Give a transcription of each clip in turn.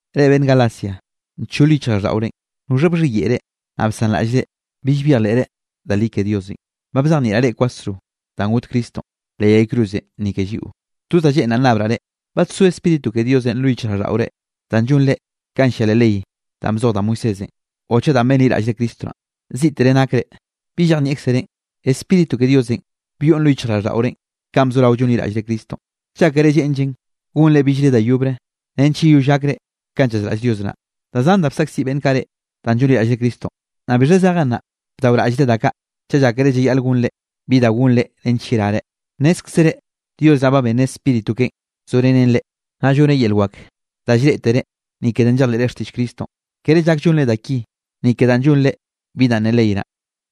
Reꞌ beꞌnn Galacia, nchol yichjraꞌlldaꞌorenꞌ. ¿Noxha bxhiyeꞌe reꞌ, naꞌ bsanraꞌllre bill byejleꞌre da li ke Diosenꞌ? Ba bzejnieꞌraꞌ reꞌ kwasro danꞌ got Cristonꞌ leꞌ yay cruzenꞌ ni ke lliꞌo. Toz danꞌ lleꞌnraꞌ nnabraꞌ reꞌ: ¿Badsó Spíritu ke Diosenꞌ lo yichjraꞌlldaꞌore danꞌ llonre kanꞌ llia leꞌ ley danꞌ bzoj da Moisésenꞌ o chaꞌ danꞌ benliraꞌllre Cristo naꞌn? Ziꞌtere nakre. ¿Bi llejnieꞌkzerenꞌ? Spíritu ke Diosenꞌ byoꞌn lo yichjraꞌlldaꞌorenꞌ kanꞌ bzorao llonliraꞌllre Cristonꞌ. ¿Llákere lleꞌnllen gonre billre da yobre nench yeyoll gakre kanꞌ llazraꞌll Dios naꞌ? Da zan da bsaꞌkziꞌ beꞌnn kaꞌ reꞌ danꞌ llonliraꞌllre Cristonꞌ. ¿Naꞌ bixha zejen naꞌ bdaoraꞌllre da kaꞌ chaꞌ llákere llayaꞌl gonre bi da gonre nench yerare? Nnézkzere Dios naꞌ ba benneꞌ Spíritu keꞌen zorenen reꞌ, naꞌ lloneꞌ yel wak da llreꞌtere ni ke danꞌ llejleꞌre xtiꞌll Cristonꞌ, kere llak llonre da ki ni ke danꞌ llonre bi danꞌ ne ley naꞌ.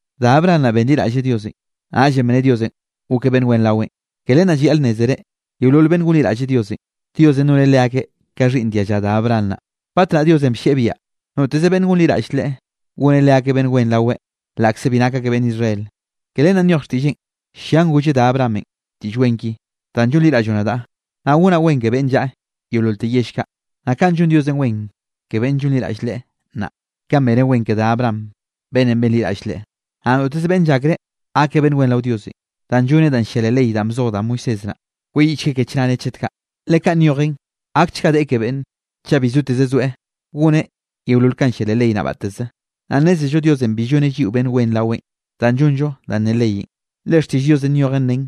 Da Abraham naꞌ benliraꞌlleꞌ Diosenꞌ, naꞌllenꞌ bne Diosenꞌ gokeꞌ beꞌnn wen raweꞌn. Ke len naꞌ llayaꞌl nnézere, yeolol beꞌnn gonliraꞌlle Diosenꞌ, Diosenꞌ noneꞌ leakeꞌ ka xhiꞌnn dialla da Abraham naꞌ. Batnaꞌ Diosenꞌ bllieꞌ biaꞌa noteze beꞌnn gonliraꞌlle Leꞌe, goneꞌ leakeꞌ beꞌnn wen raweꞌ laꞌkze bi nak akeꞌ beꞌnn Israel. Ke len naꞌ nyoj xtiꞌlleꞌn llian golleꞌ da Abrahamenꞌ diꞌll wen ki: “Danꞌ llonliraꞌlloꞌ nadaꞌ, naꞌ gonaꞌ wen ke beꞌnn llaꞌa yeololte yell kaꞌ.” Naꞌ kaꞌn llon Diosenꞌ wen ke beꞌnne llonliraꞌll Leꞌe nnaꞌ, kanꞌ beneꞌ wen ke da Abraham beꞌnnenꞌ benliraꞌll Leꞌe. Naꞌ noteze beꞌnne llakre gakeꞌ beꞌnn wen rao Diosenꞌ danꞌ lloneꞌ danꞌ llia leꞌ ley danꞌ bzoj da Moisés naꞌ, kweyiꞌchgueꞌ ke chnare chet kaꞌ, le nyoj xtiꞌll Diosenꞌ llian: “Gakchga deꞌe ke beꞌnn, chaꞌ bi soteze soeꞌ goneꞌ yeolol kanꞌ llia leꞌ ley naꞌ batteze.” Naꞌ nnézello Diosenꞌ bi lloneꞌ lliꞌo beꞌnn wen raweꞌ danꞌ llonllo danꞌ ne leyenꞌ, le xtiꞌll Diosenꞌ nyojen nen: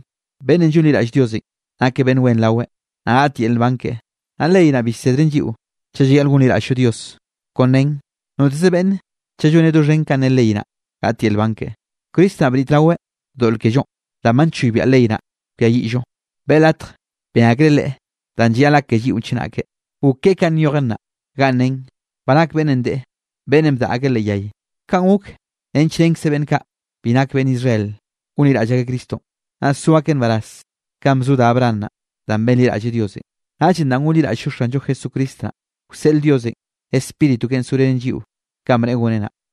“Beꞌnnenꞌ llonliraꞌll Diosenꞌ nakeꞌ beꞌnn wen raweꞌ, naꞌ gaꞌt yel nban keꞌe.” Naꞌ ley naꞌ bi llsedren lliꞌo chaꞌ llayaꞌl gonliraꞌll-llo Dios, kon nen: “Noteze beꞌnne chaꞌ lloneꞌ doxhen kanꞌ ne ley naꞌ, gaꞌt yel nban keꞌe.” Cristo naꞌ bnitraweꞌ doꞌl kellonꞌ danꞌ ba nchoybiaꞌ ley naꞌ kwiayiꞌllo. Beꞌe latj ben akreꞌ Leꞌe danꞌ llayaꞌl gak ke lliꞌon chenake. Gok keꞌe kanꞌ nyojen naꞌ, ganꞌ nen: “Ba nak beꞌnnenꞌ deꞌe, beꞌnnenꞌ bdaꞌa akeꞌ leꞌ yay.” Kanꞌ gok nench renkze beꞌnn kaꞌ bi nak beꞌnn Israel gonliraꞌll akeꞌ Cristonꞌ, naꞌ so akeꞌ nbaraz kanꞌ bzo da Abraham naꞌ danꞌ benliraꞌlleꞌ Diosenꞌ. Naꞌllenꞌ danꞌ gonliraꞌll-llo Xanllo Jesucristo naꞌ, wseꞌl Diosenꞌ Spíritu keꞌen zorenen lliꞌo kanꞌ bneꞌe goneꞌ naꞌ.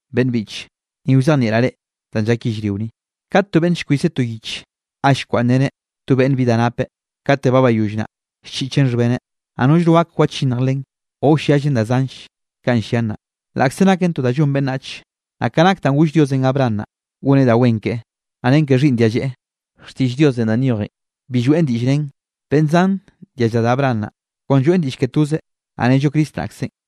Beꞌnn biꞌche, ni wzejnieꞌraꞌ reꞌ danꞌ llak yellrio ni: Kat to beꞌnne llkwiseꞌ to yich ga llkwaꞌnnreneꞌ to beꞌnn bi da napeꞌ, kate ba bayoll naꞌ, llchiꞌcheꞌn xhbeneꞌ, naꞌ nollno gak wachinnj len o wlliallen da zanll kanꞌ llian naꞌ, laꞌkze naken to da llon beꞌnnach. Naꞌ ka nak danꞌ goll Diosenꞌ Abraham naꞌ, goneꞌ da wen keꞌe, naꞌ ren ke xhiꞌnn dialleꞌe, xtiꞌll Diosenꞌ danꞌ nyojen bi lloeꞌn diꞌll nen, beꞌnn zan dialla da Abraham naꞌ, kon lloeꞌn diꞌll ke tozeꞌ, naꞌ nello Cristo naꞌkzenꞌ.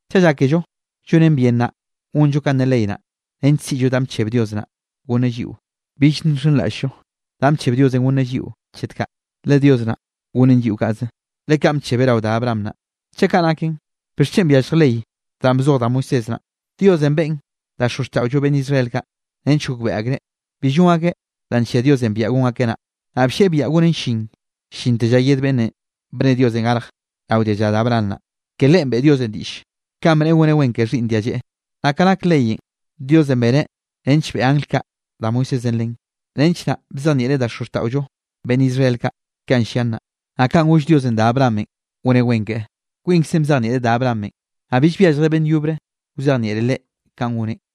Chaꞌ llákello llonen bien naꞌ gonllo kanꞌ ne ley naꞌ, nench siꞌllo danꞌ bcheb Dios naꞌ gonneꞌ lliꞌo, bill nxenraꞌll-llo danꞌ bcheb Diosenꞌ gonneꞌ lliꞌo chet kaꞌ. Le Dios naꞌ gonneꞌn lliꞌo kaꞌze, le kaꞌn bchebeꞌ rao da Abraham naꞌ. Chaꞌ kaꞌ naken, ¿bixchen byallj ley danꞌ bzoj da Moisés naꞌ? Diosenꞌ beꞌen da xozxtaꞌollo beꞌnn Israel kaꞌ, nench gokbeꞌe akreꞌ bi llon akeꞌ danꞌ nllia Diosenꞌ biaꞌa gon akeꞌ naꞌ. Naꞌ bllieꞌ biaꞌa gonen llin llinte lla yed beꞌnnenꞌ bne Diosenꞌ garjeꞌ rao dialla da Abraham naꞌ, ke Leꞌen beꞌe Diosenꞌ diꞌll kanꞌ bneꞌe goneꞌ wen ke xhiꞌnn dialleꞌe. Naꞌ ka nak leyenꞌ, Diosenꞌ beneꞌ nench beꞌe angl kaꞌ da Moisésenꞌ len, nench naꞌ bzejnieꞌreꞌ da xozxtaꞌollo beꞌnn Israel kaꞌ kanꞌ llian naꞌ. Naꞌ kanꞌ goll Diosenꞌ da Abrahamenꞌ goneꞌ wen keꞌe, kwinkze bzejnieꞌreꞌ da Abrahamenꞌ, naꞌ bill byalljreꞌ beꞌnn yobre wzejnieꞌreꞌ leꞌe kanꞌ goneꞌn.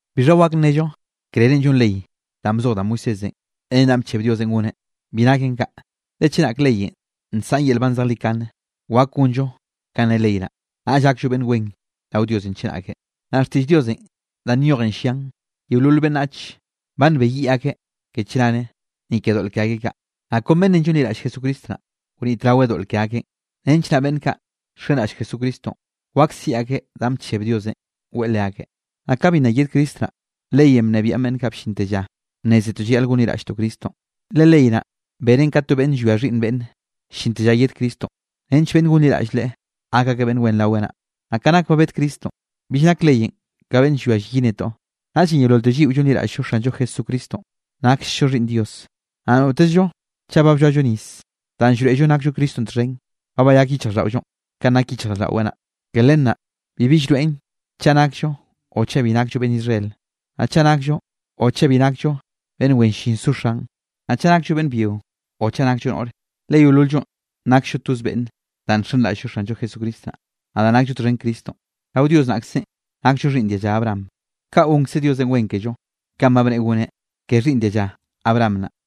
¿Bixha wak nnello krerenꞌ llon ley danꞌ bzoj da Moisésenꞌ ren danꞌ bcheb Diosenꞌ goneꞌ? Bi naken kaꞌ. Le chenak leyenꞌ nsaꞌan yel nban zejlikane, wak gonllo kanꞌ ne ley naꞌ, naꞌll gakllo beꞌnn wen rao Diosenꞌ chenake. Naꞌ xtiꞌll Diosenꞌ danꞌ nyojen llian yeolol beꞌnnach, ba nbeyiꞌ akeꞌ ke chnare, ni ke doꞌl ke akeꞌ kaꞌ, naꞌ kon beꞌnne llonliraꞌlle Jesucristo naꞌ, wnitraweꞌ doꞌl ke akeꞌn, nench naꞌ beꞌnn kaꞌ wxenraꞌll Jesucristonꞌ, wak siꞌi akeꞌ danꞌ ba bcheb Diosenꞌ weꞌe leakeꞌ. Naꞌ ka bi nna yed Cristo naꞌ, leyenꞌ bnebiaꞌn beꞌnn kaꞌ bllinte lla bnnézetoꞌ llayaꞌl gonliraꞌlltoꞌ Cristonꞌ. Le ley naꞌ benen ka to beꞌnne llwia xhiꞌnn beꞌnne, llinte lla yed Cristonꞌ nench beꞌnn gonliraꞌll Leꞌe, gak akeꞌ beꞌnn wen raweꞌ naꞌ. Naꞌ ka nak ba bed Cristonꞌ, bill nak leyenꞌ ka beꞌnn llwia llyi netoꞌ. Naꞌllenꞌ yeololte lliꞌo llonliraꞌll-llo Xanllo Jesucristonꞌ, naksllo xhiꞌnn Dios. Naꞌ notezllo chaꞌ ba blloallo nis danꞌ llroeꞌllo nakllo Cristonꞌ txhen, ba bayak yichjraꞌlldaꞌollonꞌ kanꞌ nak yichjraꞌlldaꞌweꞌ naꞌ. Ke len naꞌ bibi llroeꞌn chaꞌ nakllo o chaꞌ bi nakllo beꞌnn Israel, naꞌ chaꞌ nakllo o chaꞌ bi nakllo beꞌnn wen llin zo xan, naꞌ chaꞌ nakllo beꞌnn byio o chaꞌ nakllo noꞌre. Le yeolol-llo naksllo toz beꞌnne danꞌ nxenraꞌll-llo Xanllo Jesucristo naꞌ. Naꞌ danꞌ nakllo txhen Cristonꞌ, rao Dios naꞌkzenꞌ nakllo xhiꞌnn dialla Abraham, kaꞌ gonkze Diosenꞌ wen kello kanꞌ ba bneꞌe goneꞌ ke xhiꞌnn dialla Abraham naꞌ.